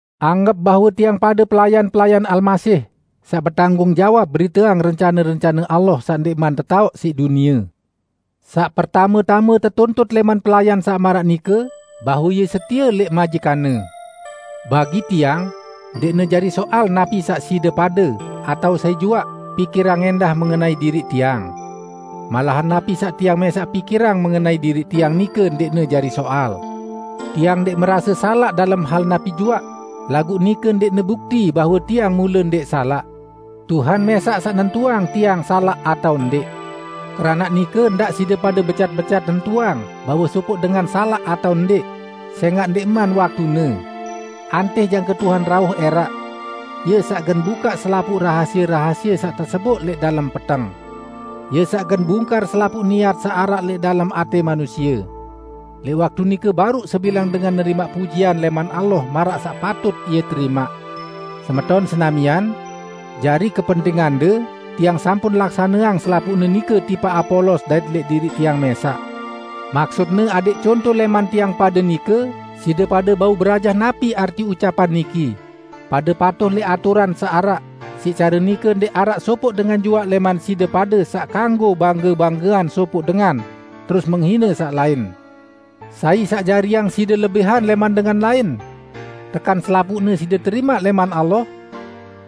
Anggep bahwe tiang pade pelayan-pelayan Almasih, saq betanggung jawab beriteang rencane-rencane Allah saq ndẽqman tetaoq siq dunie. Saq pertame-tame tetuntut lẽman pelayan saq maraq nike, bahwe ie setie lẽq majikanne. Bagi tiang, ndẽqne jari soal napi saq side pade -- atao sai juaq -- pikirang ẽndah mengenai diriq tiang. Malahan napi saq tiang mẽsaq pikirang mengenai diriq tiang nike ndẽqne jari soal. Tiang ndẽq merase salaq dalem hal napi juaq, laguq nike ndẽqne bukti bahwe tiang mule ndẽq salaq. Tuhan mẽsaq saq nentuang tiang salaq atao ndẽq. Keranaq nike, ndaq side pade becat-becat nentuang bahwe sopoq dengan salaq atao ndẽq, sẽngaq ndẽqman waktune. Antih jangke Tuhan rauh ẽraq. Ie saq gen bukaq selapuq rahasie-rahasie saq teseboq lẽq dalem peteng. Ie saq gen bungkar selapuq niat saq araq lẽq dalem atẽ manusie. Lẽq waktu nike baruq sebilang dengan nerimaq pujian lẽman Allah maraq saq patut ie terimaq. Semeton senamian! Jari kepentingande, tiang sampun laksaneang selapuqne nike tipaq Apolos dait lẽq diriq tiang mẽsaq. Maksutne adẽq conto lẽman tiang pade nike, side pade bau berajah napi arti ucapan niki, "Pade patuh lẽq aturan saq araq", siq care nike ndẽq araq sopoq dengan juaq lẽman side pade saq kanggo bangge-banggeang sopoq dengan, terus menghine saq lain. Sai saq jariang side lebihan lẽman dengan lain? Tekan selapuqne side terimaq lẽman Allah?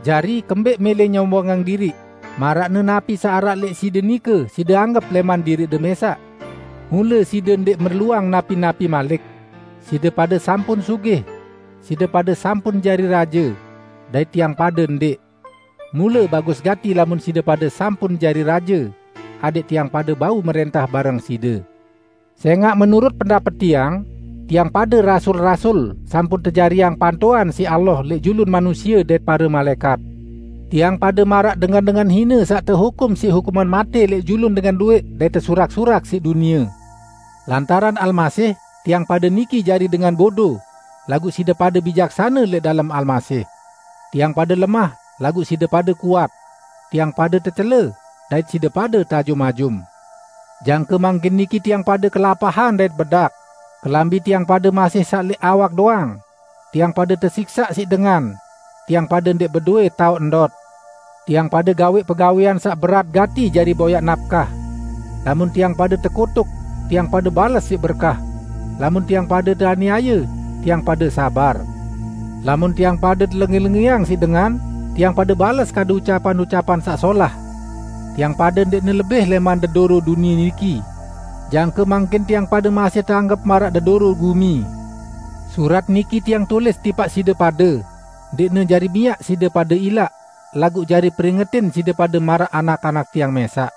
Jari, kembẽq mẽlẽ nyombongang diriq, maraqne napi saq araq lẽq side nike side anggep lẽman diriqde mẽsaq? Mule side ndẽq merluang napi-napi malik! Side pade sampun sugih! Side pade sampun jari raje! Dait tiang pade ndẽq. Mule bagus gati lamun side pade sampun jari raje, adẽq tiang pade bau mrẽntah bareng side. Sẽngaq menurut pendapet tiang, tiang pade rasul-rasul, sampun tejariang pantoan siq Allah lẽq julun manusie dait pare malaẽkat. Tiang pade maraq dengan-dengan hine saq tehukum siq hukuman matẽ lẽq julun dengan luwẽq dait tesurak-surak siq dunie. Lantaran Almasih, tiang pade niki jari dengan bodo, laguq side pade bijaksane lẽq dalem Almasih! Tiang pade lemah, laguq side pade kuat! Tiang pade tecele, dait side pade teajum-ajum! Jangke mangkin niki tiang pade kelapahan dait bedak; kelambi tiang pade masih saq lẽq awak doang; tiang pade tesiksaq siq dengan; tiang pade ndẽq bedowẽ taoq ndot; tiang pade gawẽq pegawẽan saq berat gati jari boyaq napkah. Lamun tiang pade tekutuk, tiang pade bales siq berkah; lamun tiang pade teaniaye, tiang pade sabar; lamun tiang pade telengẽ-lengẽang siq dengan, tiang pade bales kadu ucapan-ucapan saq solah. Tiang pade ndẽqne lebih lẽman dedoro dunie niki; jangke mangkin tiang pade masih teanggep maraq dedoro gumi. Surat niki tiang tulis tipaq side pade, ndẽqne jari miaq side pade ilaq, laguq jari peringetin side pade maraq anak-anak tiang mẽsaq.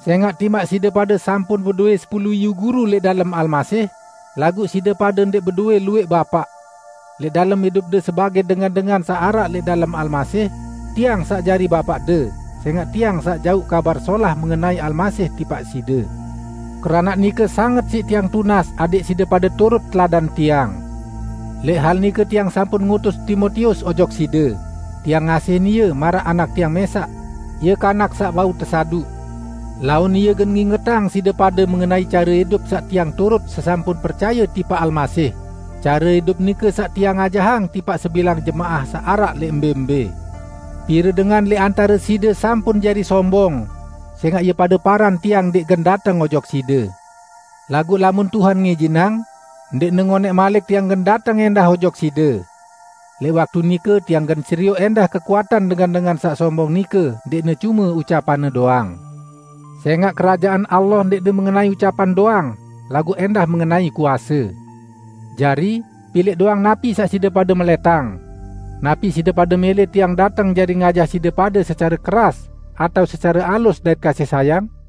Sẽngaq timaq side pade sampun bedowẽ sepulu iyu guru lẽq dalem Almasih, laguq side pade ndẽq bedowẽ luwẽq bapaq. Lẽq dalem idupde sebagẽ dengan-dengan saq araq lẽq dalem Almasih, tiang saq jari bapaqde, sẽngaq tiang saq jauq Kabar Solah mengenai Almasih tipaq side. Keranaq nike sanget siq tiang tunas adẽq side pade turut teladan tiang. Lẽq hal nike tiang sampun ngutus Timotius ojok side, tiang ngasihin ie maraq anak tiang mẽsaq. Ie kanak saq bau tesaduq. Laun ie gen ngingetang side pade mengenai care idup saq tiang turut sesampun percaye tipaq Almasih, care idup nike saq tiang ajahang tipaq sebilang jemaah saq araq lẽq mbẽ-mbẽ. Pire dengan lẽq antare side sampun jari sombong, sẽngaq ie pade paran tiang ndẽq gen dateng ojok side. Laguq lamun Tuhan ngijinang, ndẽqne ngonẽq malik tiang gen dateng ẽndah ojok side. Lẽq waktu nike, tiang gen serioq ẽndah kekuatan dengan-dengan saq sombong nike; ndẽqne cume ucapanne doang. Sẽngaq Kerajaan Allah ndẽqne mengenai ucapan doang, laguq ẽndah mengenai kuase. Jari, pilẽq doang napi saq side pade melẽtang! Napi side pade mẽlẽ tiang dateng jari ngajah side pade secare keras atao secare alus dait kasih sayang?